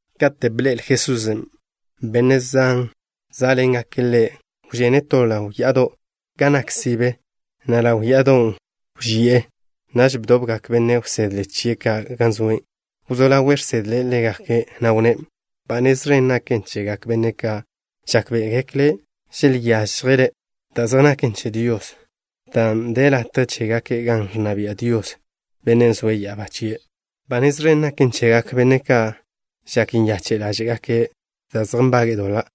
Kate' bḻe'el Jesusen' benne' zan zá'ḻengake' Ḻe', wžene' to ḻaw ya'ado' gan nak sibe, na' ḻaw ya'adon' wži'e. Naž bdobgak benne' wsedle chie' ka' gan zoe'. Wzó ḻawe' žsedle' ḻégake', na' wnné': —Ba nez ẕen naken chegak benne' ka' žákbe'egekle' želyážjele' da' zej naken che Dios, dan' de latje chégake' gan ẕnna bia' Dios, Bennen' zoe' ya'abá chie'. ’Ba nez ẕen naken chegak benne' ka' žak nyache' ḻáže'gake' dan' zej nbage'e doḻa',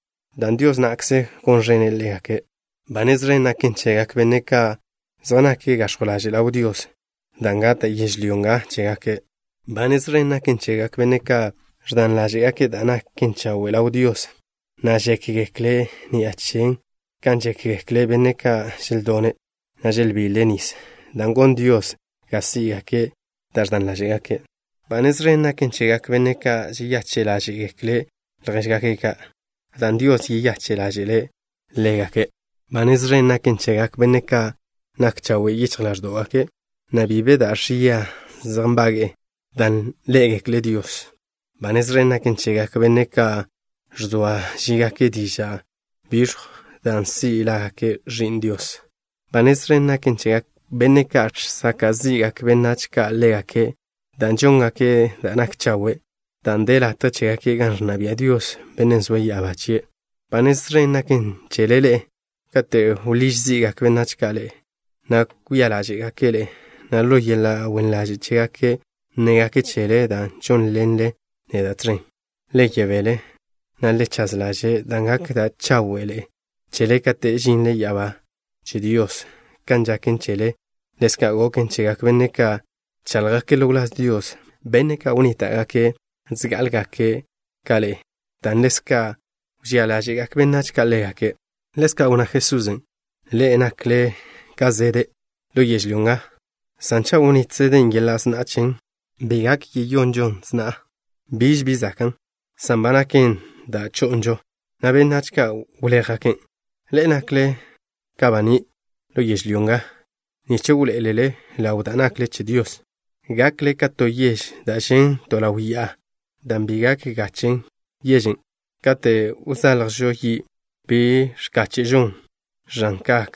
dan' Dios na'kze gon ẕene' ḻégake'. ’Ba nez ẕen naken chegak benne' ka' zej nake' gax̱jw ḻaže' ḻaw Dios, dan' gata' yežlyó nga chégake'. ’Ba nez ẕen naken chegak benne' ka' ẕdan ḻáže'gake' da' naken chawe' ḻaw Dios, na' žékgekle' ni'a chen kan žékgekle benne' ka' želdone', na' želbile' nis, dan' gon Dios ga sí'gake' dan' ẕdan ḻáže'gake'. ’Ba nez ẕen naken chegak benne' ka' žeyache' ḻáže'gekle' ljéžgake' ka', dan' Dios yeyache' ḻáže'le' ḻégake'. ’Ba nez ẕen naken chegak benne' ka' nak chawe' yichj ḻáẕdo'gake', na' bi be da' ẕia zej nbage'e, dan' ḻé'egekle' Dios. ’Ba nez ẕen naken chegak benne' ka' ẕzoa žígake' diža' biẕjw, dan' si' lágake' ẕi'n Dios. ’Ba nez ẕen naken chegak benne' ka' žsaka' zi'gak benách ka' ḻégake' dan' žóngake' da' nak chawe', dan' de latje chégake' gan ẕnna bia' Dios, Bennen' zoe' ya'abá chie'. ’Ba nez ẕen gaken chele ḻe'e kate' wḻíž zi'gak benách ka' ḻe'e, na' kwia ḻáže'gake' ḻe'e, na' ḻo yeḻa' wen ḻaže' chégake' nnégake' chele dan' žónḻenle neda' tẕen. Le yebél, na' le chaž ḻaže', dan' gak da' cháwe'ḻe'e chele kate' žinle ya'abá che Dios. Kan žaken chele, ḻezka' goken chegak benne' ka' bcháḻjgake' ḻo wláz Dios, benne' ka' wnníta'gake' zgá'alegake' ka ḻe'e, dan' ḻezka' wžía ḻáže'gak benách ka' ḻégake'. Ḻezka' wnná Jesusen': —Ḻe'e nakle ka zede' ḻo yežlyó nga, san cha' wnít zeden' yeḻa' sna'a chen, bi gak yeyonžon sna'a. Biž bi zakan', san ba naken da' cho'nžon, na' benách ka' wléjgaken'. ’Ḻe'e nakle ka baní' ḻo yežlyó nga nich wḻoé'elele ḻaw da' nakle che Dios. Gakle ka to yež da' žen' to ḻaw ya'a, dan' bi gak gache' yežen'. Kate' wzaḻjžo yi', bi ẕkáche'žon ẕan kak,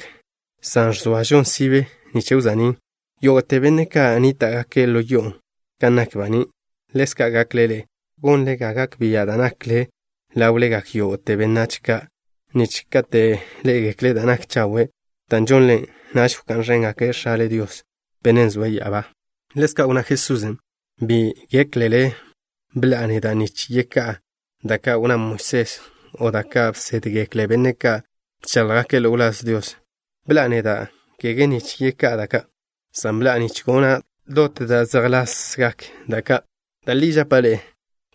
san ẕzoažon sibe nich wza'nín' yógo'te benne' ka' nníta'gake' ḻo yo'on'. Kan nak baní', ḻezka' gakle ḻe'e, dan' gonle ga gak bia' da' nakle ḻáwlegak yógo'te benách ka', nich kate' ḻé'egekle' da' nak chawe' da' žonle, naž wká'n ẕéngake' X̱ale Dios, Bennen' zoe' ya'abá. Ḻezka' wnná Jesusen': —Bi géklele bḻa'a neda' nich yeká'a da' ka' wnná Moisés o da' ka' bsédgekle benne' ka' bcháḻjgake' ḻo wláz Dios. Bḻa'a neda', kege nich yeká'a da' ka', san bḻa'a nich gona' dot da' zejlasgak da' ka'. Da' li žapa' ḻe'e.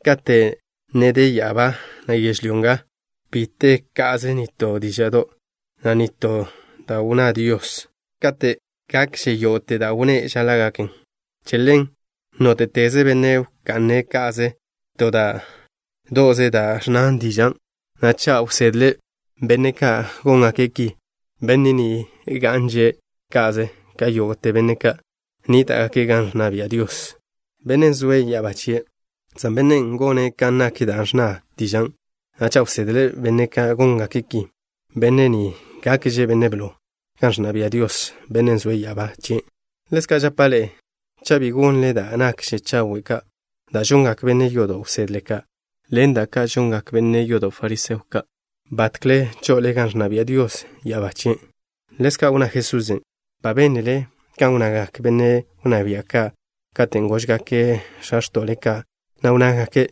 Kate' ne de ya'abá, na' yežlyó nga, bi te ka'ze nitó díža'do', na' nitó da' wnná Dios kate' gakže yógo'te da' wnné' žaḻa' gaken. Che ḻen, nóte'teze benne' wka'ne' ca'ze to da' do'ze da' ẕnna dižan', na' cha' wsedle' benne' ka' góngake' ki, benne' ni ga'nže' ka'ze ka yógo'te benne' ka' nníta'gake' gan ẕnna bia' Dios, Bennen' zoe' ya'abá chie', san bennen' gone' kan nak da' ẕnna dižan', na' cha' wsedle' benne' ka' góngake' ki, benne' ni gakže' benne' blo gan ẕnna bia' Dios, Bennen' zoe' ya'abá chien'. Ḻezka' žapa' ḻe'e: cha' bi gonle da' nakže chawe' ka da' žongak benne' yodo' wsedle ka', ḻen ka žongak benne' yodo' fariseo ka', batkle cho'ole gan ẕnna bia' Dios ya'abá chien'. Ḻezka' wnná Jesusen': —Ba bénlele kan wnnagak benne' wnná bia' ka' katen' góžgake' x̱a x̱to'le ka', na' wnnágake':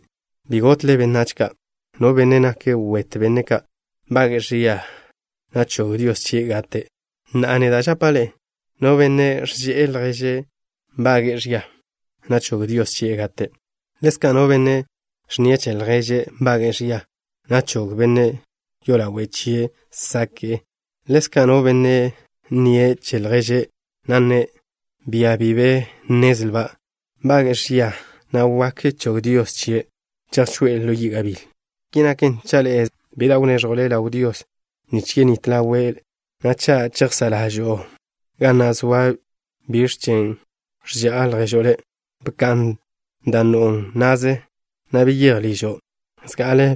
“Bi gotle benách ka'. No benne' nake' wet benne' ka', nbage'e ẕia, na' chog Dios chie' gate'.” Na'a, neda' žapa' ḻe'e: no benne' ẕže'e lježe' nbage'e ẕia, na' chog Dios chie' gate'. Ḻezka' no benne' ẕnnie' che lježe' nbage'e ẕia, na' chog benne' yolawe' chie' sake'e. Ḻezka' no benne' nnie' che lježe', na' nne': “Bia bi be nnezlba'” nbage'e ẕia, na' wak chog Dios chie' chejchoé'e ḻo yi' gabíl. ’Ki naken, cha' le' zoa ko'o ḻo bkog la'y bi da' wneẕjo' ḻaw Dios nich yenít ḻawe' le', na' cha' chejsá' ḻažo'o ga na' zoa biẕ chen ẕža'a lježo' le', bka'n dan' no'o na'ze, na' beyéj ližo'. Zga'ale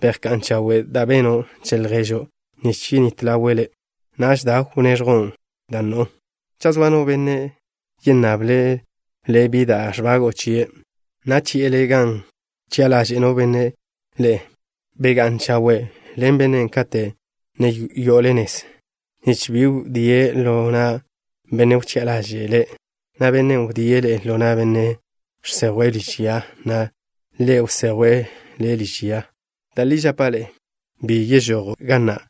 bejká'n chawe' da' beno' che lježo' nich yenít ḻawe' le'. Naž da, wneẕjo' dan' no'o. ’Cha' zoa no benne' yennable' le' bi da' ẕbago'o chie', na' chi'e le' gan wchi'a ḻaže' no benne' ḻe'e, begá'n chawe' ḻen bennen' kate' ne yo'ole nez, nich bi wdíe' le' ḻo na' bennen' wchi'a ḻaže'e le', na' bennen' wdíe' le' ḻo na' benne' žsejwe' liž ya, na' ḻe' wsejwe' le' liž yan'. Da' li žapa' le', bi yežojo' ga na'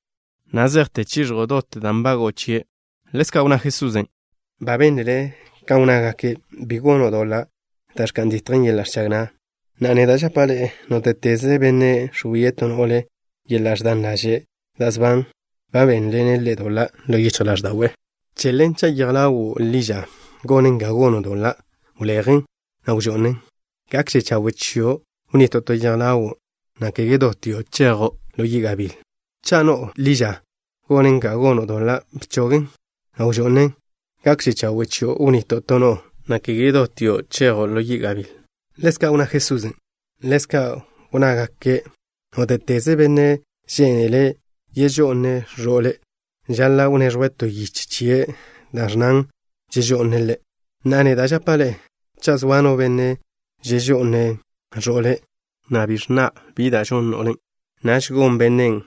na' zejte chiẕjo' dot da' nbago'o chie'. Ḻezka' wnná Jesusen': —Ba bénlele kan wnnágake': “Bi gono' doḻa' da' ẕka'n ditjen yeḻa' ẕchag na'.” Na'a, neda' žapa' ḻe'e: nóte'teze benne' ẕwie' to no'le ḻo yeḻa' ẕdan ḻaže' da' sban, ba benḻene' ḻe' doḻa' ḻo yichj ḻáẕda'we'. ’Che ḻen, cha' yej ḻawo' ḻi ža gonen ga gono' doḻa', wlejen, na' wžo'nen. Gakže chawe' chio' wnito' to yej ḻawo', na' kege dotio' chazen ḻo yi' gabíl. Cha' no'o ḻi ža gonen ga gono' doḻa', bchogen, na' wžo'nen. Gakže chawe' chio' wnito' to no'o, na' kege dotio' chazen ḻo yi' gabíl. Ḻezka' wnná Jesusen': —Ḻezka' wnnágake': “Nóte'teze benne' žénele' yežo'ne' ẕo'le', žaḻa' wneẕjwe' to yiche chie' da' ẕnnan žežo'ne' ḻe'.” Na'a, neda' žapa' ḻe'e, cha' zoa no benne' žežo'ne' ẕo'le', na' bi ẕnna' bi da' žon no'len', naž gon bennen'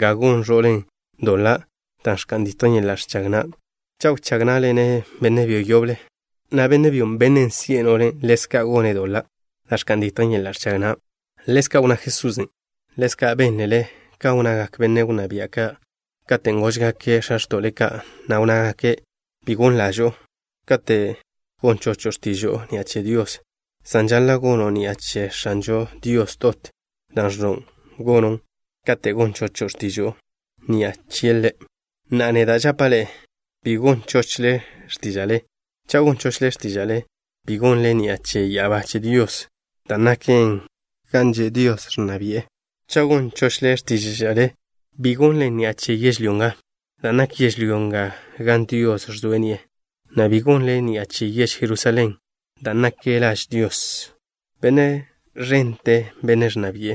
ga gon ẕo'len' doḻa' da' ẕka'n ditjen yeḻa' ẕchag na' cha' wchág ná'ḻene' benne' byo yoble, na' benne' byon', bennen' si'e no'len', ḻezka' gone' doḻa' da' ẕka'n ditjen yeḻa' ẕchag na'. Ḻezka' wnná Jesusen': —Ḻezka' bénlele kan wnnagak benne' wnná bia' ka' katen' góžgake' x̱a x̱to'le ka', na' wnnágake': “Bi gon ḻažo'o kate' gon chocho' x̱tižo'o ni'a che Dios, san žaḻa' gono' ni'a che X̱anžo Dios dot dan' ẕnno' gono' katen' gon chocho' x̱tižo'o ni'a chie' Ḻe'.” Na'a, neda' žapa' ḻe'e, bi gon chochle x̱tíža'le. Cha' gon chochle x̱tíža'le, bi gonlen ni'a che ya'abá che Dios, dan' naken gan že' ẕnna bia' Diosen'. Cha' gon chochle x̱tíža'le, bi gonlen ni'a che yežlyó nga, dan' nak yežlyó nga gan Dios ẕzoe' ni'e, na' bi gonlen ni'a che yež Jerusalén, dan' naken laž Dios, Benne' ẕente, Bennen' ẕnna bi'e.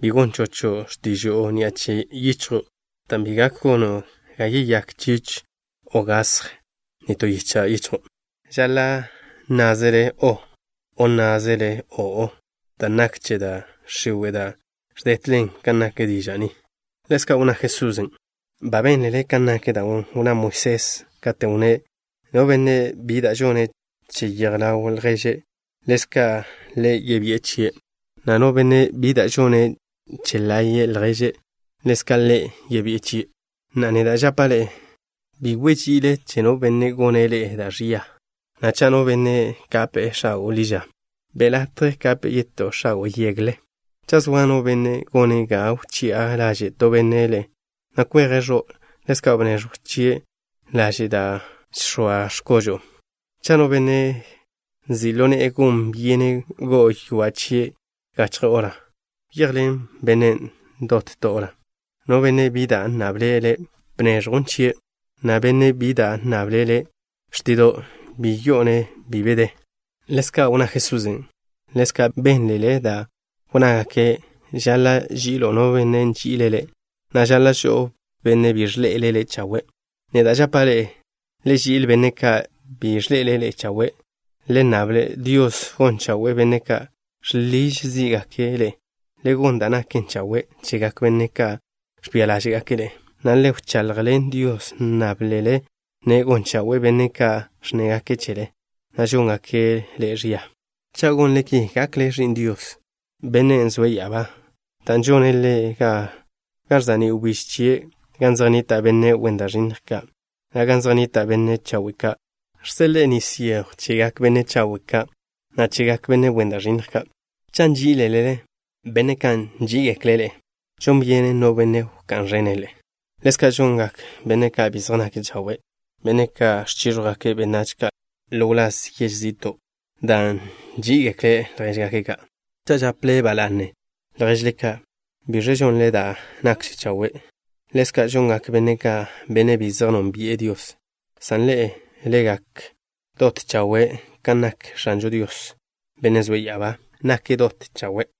Bi gon chocho' x̱tižo'o ni'a che yichjo', dan' bi gak gono' ga yeyák chich o gasj nitó yicha' yichjo'. Žaḻa' nnázele: “o'” o nnázele: “o'o” dan' nak che da' x̱iwe' da' ẕdetlen kan nak diža' ni. Ḻezka' wnná Jesusen': —Ba bénlele kan nak da' wnná Moisés, katen' wnné': “No benne' bi da' žone' che yej ḻaw lježe', ḻezka' le yebí'i chie', na' no benne' bi da' žone' che laye' lježe', ḻezka' le yebí'i chie'.” Na'a, neda' žapa' ḻe'e: bi wži'ile che no benne' gone' ḻe'e da' ẕia, na' cha' no benne' kape'e x̱ago' ḻi ža, be' latje kape'e yetó x̱ago' yegle. Cha' zoa no benne' gone' ga wchi'a ḻaže' to benne' le', na' kweje' ẕo', ḻezka' bneẕjw chie' laže' da' žx̱oa x̱kožo'o. Cha' no benne' nzi' ḻo ne'e gon byene' go'o ywa' chie' gachje hora, wyejḻen bennen' dot to hora. No benne' bi da' nnable' le', bneẕjwn chie', na' no benne' bi da' nnable' le' xtido', bi yi'o-ne' bi be de. Ḻezka' wnná Jesusen': —Ḻezka' bénlele dan' wnnágake': “Žaḻa' ži'ilo' no benne' nži'ile' le', na' žaḻa' žo'o no benne' bi de le' chawe'.” Neda' žapa' ḻe'e, le ži'il benne' ka' bi zej de ḻe'e chawe'. Le nnable Dios gon chawe'e benne' ka' žḻiž zí'gake' ḻe'e. Le gon da' naken chawe' chegak benne' ka' ẕbia ḻáže'gake' ḻe'e, na' le wchaḻjḻen Dios, nnáblele-ne' gon chawe'e benne' ka' ẕnnégake' chele, na' žóngake' ḻe'e ẕia. Cha' gonle ki, gakle ḻe'e ẕi'n X̱ažo Dios, Bennen' zoe' ya'abá, dan' žone' Ḻe' ga ẕza'ní' wbíž chie' gan zej nnita' benne' wen da' ẕinnj ka', na' gan zej nnita' benne' chawe' ka'. Žseḻe'e nis yejw chegak benne' chawe' ka', na' chegak benne' wen da' ẕinnj ka'. Cha' nží'izelele benne' ka' nží'igekle' ḻe'e, ¿žon byenen no benne' wká'n ẕene' ḻe'e? Ḻezka' žongak benne' ka' bi zej nake' chawe', benne' ka' ẕchíẕjwgake' benách ka' ḻo wláz yež zi'to', dan' nží'igekle' ljéžgake' ka'. Cha' žaple ba la'ne ljéžzele ka', ¿biẕe žonle da' nakže chawe'? Ḻezka' žongak benne' ka', benne' bi zej nónbi'e Dios. San ḻe'e, le gak dot chawe', kan nak X̱ažo Dios, Bennen' zoe' ya'abá, nake' dot chawe'.